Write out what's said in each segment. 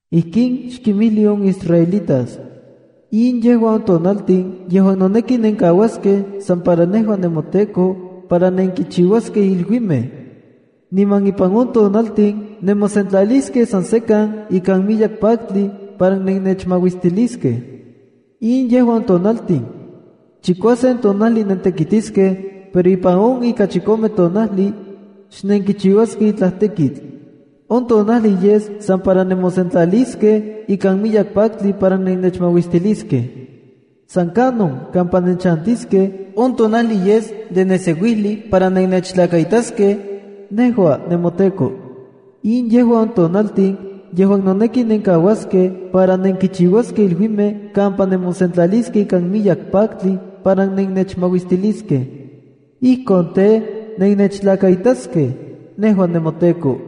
“Ijkin xkinmijli on israelitas: In yejua on tonaltin yejuan noneki nenkauaskej san para nejua nemoTEKO para nenkichiuaskej iluimej, niman ipan on tonaltin nemosentlaliskej san sekan ikan miyek paktli para nennechmauistiliskej. In yejua on tonaltin: Chikuasen tonajli nentekitiskej, pero ipan on ika chikome tonajli, xnenkichiuaskej itlaj tekitl. On tonajli yes san para nemosentlaliskej ikan miyek paktli para nennechmauistiliskej. San kanon kampa nenchantiskej on tonajli yes de neseuijli para nennechtlakaitaskej, nejua nemoTEKO. In yejua on tonaltin yejuan noneki nenkauaskej para nenkichiuaskej iluimej kampa nemosentlaliskej ikan miyek paktli para nennechmauistiliskej. Ijkon tej, nennechtlakaitaskej, nejua nemoTEKO.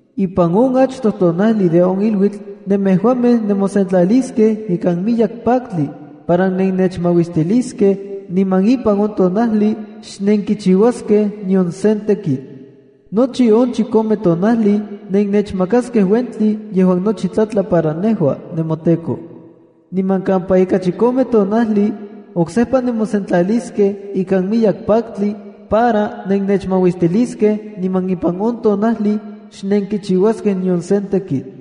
Ipan on achtoj tonajli de on iluitl nemejuamej nemosentlaliskej ikan miyek paktli para nennechmauistiliskej niman ipan on tonajli xnenkichiuaskej nion sen tekitl. Nochi on chikome tonajli nennechmakaskej uentli yejuan nochi tlatla para nejua nemoTEKO. Niman kampa ika chikome tonajli, oksejpa nemosentlaliskej ikan miyek paktli para nennechmauistiliskej, niman ipan on tonajli xnenkichiuaskej nion sen tekitl.”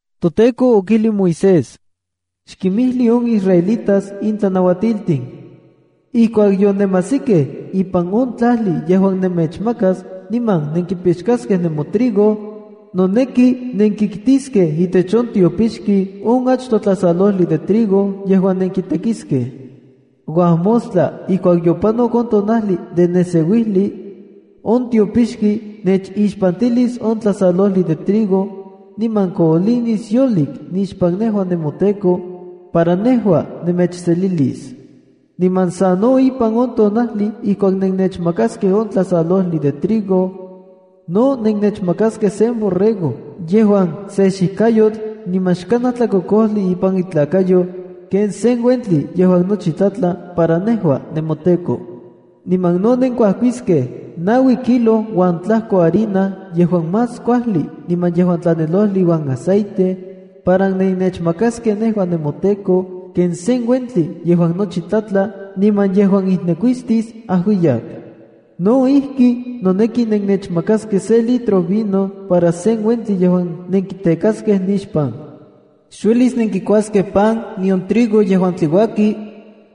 ToTEKO okijlij Moisés: “Xkinmijli on israelitas in tlanauatiltin: Ijkuak yonemajsikej ipan on tlajli yejuan nemechmakas niman nenkipixkaskej nemotrigo, noneki nenkiktiskej itech on tiopixki on achtoj tlasalojli de trigo yejuan nenkitekiskej. Uajmostla ijkuak yopanok on tonajli de neseuijli, on tiopixki nechixpantilis on tlasalojli de trigo, niman koolinis yolik nixpan nejua nemoTEKO, para nejua nemechselilis. Niman sano ipan on tonajli ijkuak nennechmakaskej on tlasalojli de trigo, no nennechmakaskej sen borrego yejuan se xijkayotl niman xkanaj tlakokojli ipan itlakayo ken sen uentli yejuan nochi tlatla para nejua nemoTEKO. Niman no nenkuajkiskej naui kilo uan tlajko harina yejuan más kuajli niman yejuan tlanelojli iuan aceite, para nennechmakaskej nejua nemoTEKO ken sen uentli yejuan nochi tlatla niman yejuan ijnekuistis ajuiyak. No ijki, noneki nennechmakaskej se litro vino para sen uentli yejuan nenkitekaskej nixpan. Xuelis nenkikuaskej pan nion trigo yejuan tliuaki,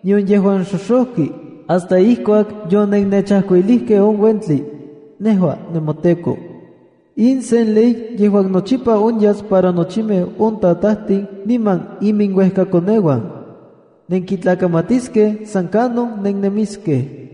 nion yejuan xoxojki, hasta ijkuak yonennechajkuilijkej on uentli, nejua nemoTEKO. In sen ley yejuan nochipa onyas para nochimej on tatajtin niman iminuejkakoneuan. Nenkitlakamatiskej san kanon nennemiskej.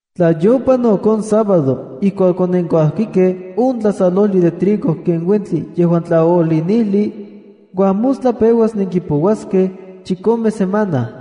’Tla yopanok on sábado ijkuak onenkuajkikej on tlasalojli de trigo ken uentli yejuan tlaoolinijli, uajmostla peuas nenkipouaskej chikome semana.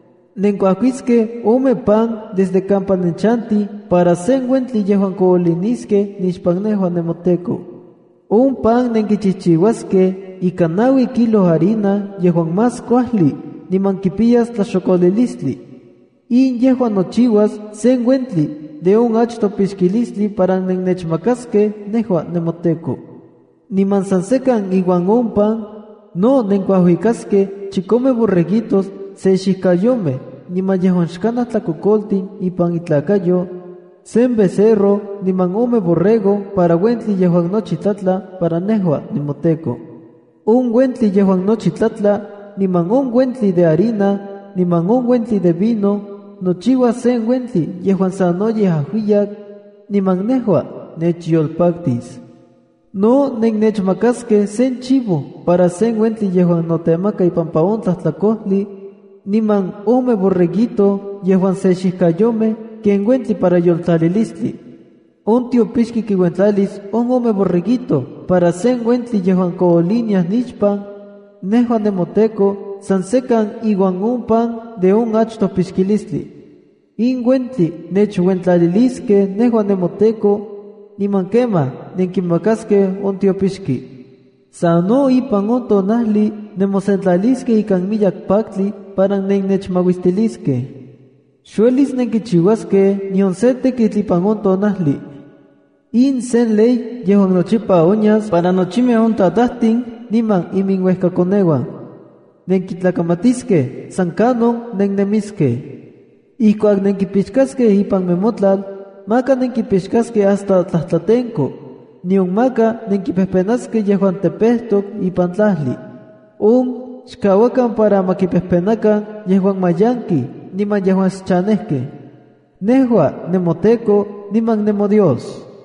Nenkuajkiskej ome pan desde kampa nenchantij para sen uentli yejuan kooliniskej nixpan nejua nemoTEKO. On pan nenkichijchiuaskej ika naui kilo harina yejuan más kuajli niman kipiyas tlaxokolilistli. In yejua nochiuas sen uentli de on achtoj pixkilistli para nennechmakaskej nejua nemoTEKO. Niman san sekan iuan on pan, no nenkuajuikaskej chikome borreguitos se xijkayomej niman yejuan xkanaj tlakokoltin ipan intlakayo, sen becerro niman ome borrego para uentli yejuan nochi tlatla para nejua nemoTEKO. On uentli yejuan nochi tlatla, niman on uentli de harina, niman on uentli de vino, nochiuas sen uentli yejuan sanoyej ajuiyak, niman nejua nechyolpaktis. No nennechmakaskej sen chivo para sen uentli yejuan notemaka ipampa on tlajtlakojli, niman ome borreguito yejuan se xijkayomej ken uentli para yoltlalilistli. On tiopixki kinuentlalis on ome borreguito para sen uentli yejuan kooliniaj nixpan, nejua nemoTEKO san sekan iuan on pan de on achtoj pixkilistli. In uentli nechuentlaliliskej nejua nemoTEKO, niman kemaj nenkimakaskej on tiopixki. ’Sano ipan on tonajli nemosentlaliskej ikan miyek paktli para nennechmauistiliskej. Xuelis nenkichiuaskej nion se tekitl ipan on tonajli. In sen ley yejuan nochipa onyas para nochimej on tatajtin niman iminuejkakoneuan. Nenkitlakamatiskej san kanon nennemiskej. ’Ijkuak nempixkaskej ipan nemotlal, maka nenkipixkaskej hasta tlajtlatenko, nion maka nenkipejpenaskej yejuan tepejtok ipan tlajli. On xkauakan para ma kipejpenakan yejuan mayankej niman yejuan xchanejkej. Nejua nemoTEKO niman nemoDios.”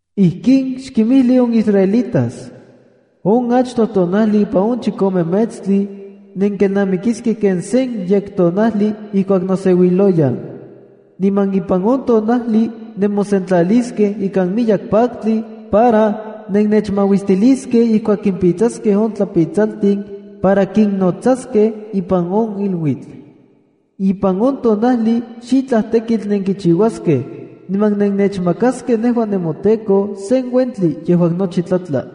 “Ijkin xkinmijli on israelitas: On achtoj tonajli ipan on chikome metstli, nenkelnamikiskej ken sen yektonajli ijkuak noseuiloyan. Niman ipan on tonajli nemosentlaliskej ikan miyek paktli para nennechmauistiliskej ijkuak kimpitsaskej on tlapitsaltin para kinnotsaskej ipan on iluitl. Ipan on tonajli xitlaj tekitl nenkichiuaskej, niman nenechmakaskej nejua nemoTEKO sen uentli yejuan nochi tlatla.”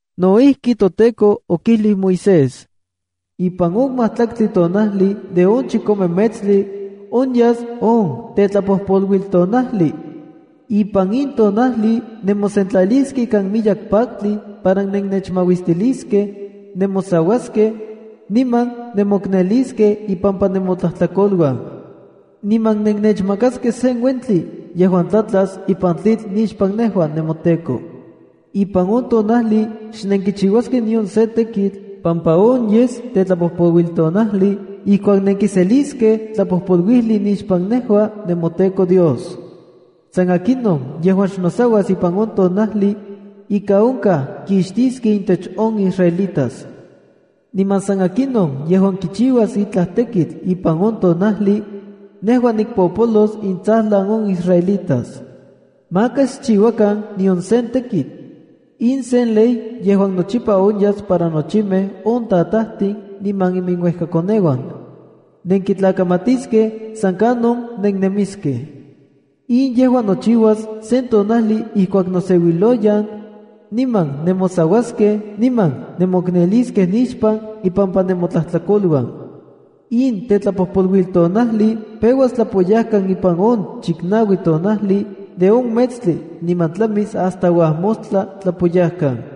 No ijki, toTEKO okijlij Moisés: “Ipan on majtlaktli tonajli de on chikome metstli, onyas on Tetlapojpoluiltonajli. Ipan in tonajli nemosentlaliskej ikan miyek paktli para nennechmauistiliskej, nemosauaskej, niman nemokneliskej ipampa nemotlajtlakoluan. Niman nennechmakaskej sen uentli yejuan tlatlas ipan tlitl nixpan nejua nemoTEKO. Ipan on tonajli xnenkichiuaskej nion sen tekitl, pampa on yes Tetlapojpoluiltonajli ijkuak nenkiseliskej tlapojpoluijli nixpan nejua nemoTEKO Dios. San akinon yejuan xnosauas ipan on tonajli, ika onkaj kixtiskej intech on israelitas. Niman san akinon yejuan kichiuas itlaj tekitl ipan on tonajli, nejua nikpopolos intsajlan on israelitas. ’Maka xchiuakan nion sen tekitl. In sen ley yejuan nochipa onyas para nochimej on tatajtin niman iminuejkakoneuan. Nenkitlamatiskej san kanon nennemiskej. In yejua nochiuas sen tonajli ijkuak noseuiloyan, niman nemosauaskej niman nemokneliskej nixpan ipampa nemotlajtlakoluan. In Tetlapojpoluiltonajli peuas tlapoyajkan ipan on chiknaui tonajli de on metstli niman tlamis hasta uajmostla tlapoyajkan.”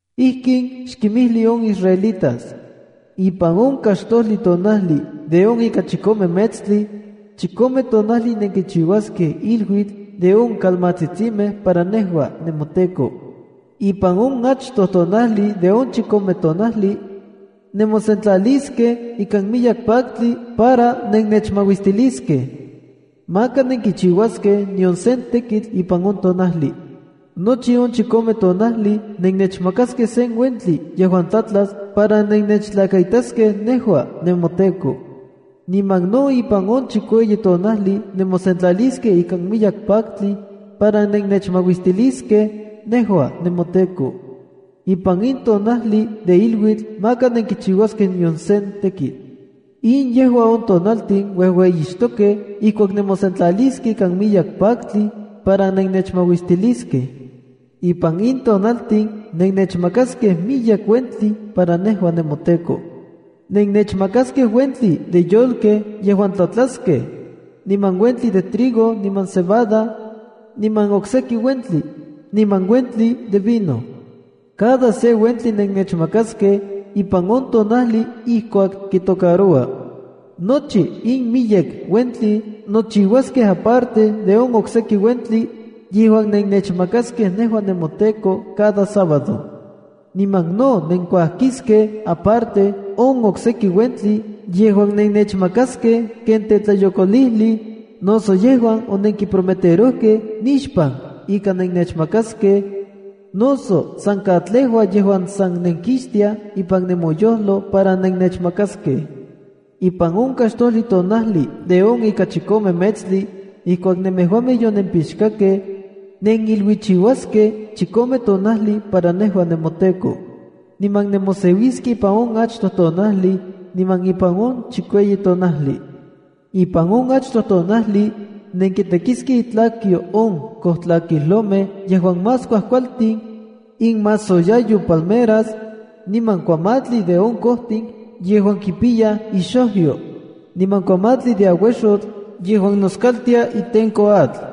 “Ijkin xkinmijli on israelitas: Ipan on kaxtojli tonajli de on ika chikome metstli, chikome tonajli nenkichiuaskej iluitl de on kalmatsitsimej para nejua nemoTEKO. Ipan on achtoj tonajli de on chikome tonajli, nemosentlaliskej ikan miyek paktli para nennechmauistiliskej. Maka nenkichiuaskej nion sen tekitl ipan on tonajli. Nochi on chikome tonajli, nennechmakaskej sen uentli yejuan tlatlas para nennechtlakaitaskej nejua nemoTEKO. Niman no ipan on chikueyi tonajli nemosentlaliskej ikan miyek paktli para nennechmauistiliskej, nejua nemoTEKO. Ipan in tonajli de iluitl maka nenkichiuaskej nion sen tekitl. ’In yejua on tonaltin uejueyixtokej ijkuak nemosentlaliskej ikan miyek paktli para nennechmauistiliskej. Ipan in tonaltin nennechmakaskej miyek uentli para nejua nemoTEKO. Nennechmakaskej uentli de yolkej yejuan tlatlaskej, niman uentli de trigo niman cebada, niman okseki uentli, niman uentli de vino. Cada se uentli nennechmakaskej ipan on tonajli ijkuak kitocaroua. Nochi in miyek uentli nochiuaskej aparte de on okseki uentli yejuan nennechmakaskej nejua nemoTEKO cada sábado. Niman no nenkuajkiskej aparte on okseki uentli yejuan nennechmakaskej ken tetlayokolijli, noso yejuan onenkiprometerojkej nixpan ika nennechmakaskej, noso san katlejua yejuan san nenkixtiaj ipan nemoyojlo para nennechmakaskej. ’Ipan on kaxtojli tonajli de on ika chikome metstli, ijkuak nemejuamej yonempixkakej, neniluichiuaskej chikome tonajli para nejua nemoTEKO. Niman nemoseuiskej ipan on achtoj tonajli, niman ipan on chikueyi tonajli. Ipan on achtoj tonajli, nenkitekiskej itlakyo on kojtlakijlomej yejuan más kuajkualtin, inmasoyayo palmeras, niman kuamatli de on kojtin yejuan kipiyaj ixojyo, niman kuamatli de auexotl yejuan noskaltia itenko atl.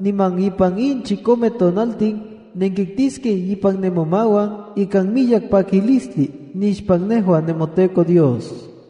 Niman ipan in chikomej tonaltin nenkiktiskej ipan nemomauan ikan miyek pakilistli nixpan nejua nemoTEKO Dios.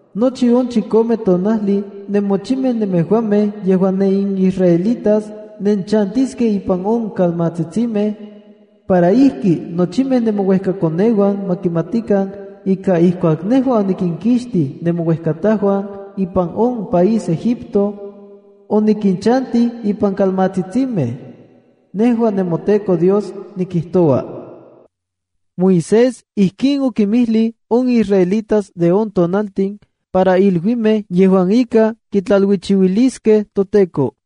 Nochi on chikome tonajli nemochimej nemejuamej yejuan nenisraelitas nenchantiskej ipan on kalmatsitsimej, para ijki nochimej nemouejkakoneuan ma kimatikan ika ijkuak nejua onikinkixtij nemouejkatajuan ipan on país Egipto, onikinchantij ipan kalmatsitsimej. Nejua nemoTEKO Dios nikijtoua.” Moisés ijkin okinmijlij on israelitas de on tonaltin para iluimej yejuan ika kitlaluichiuiliskej toTEKO.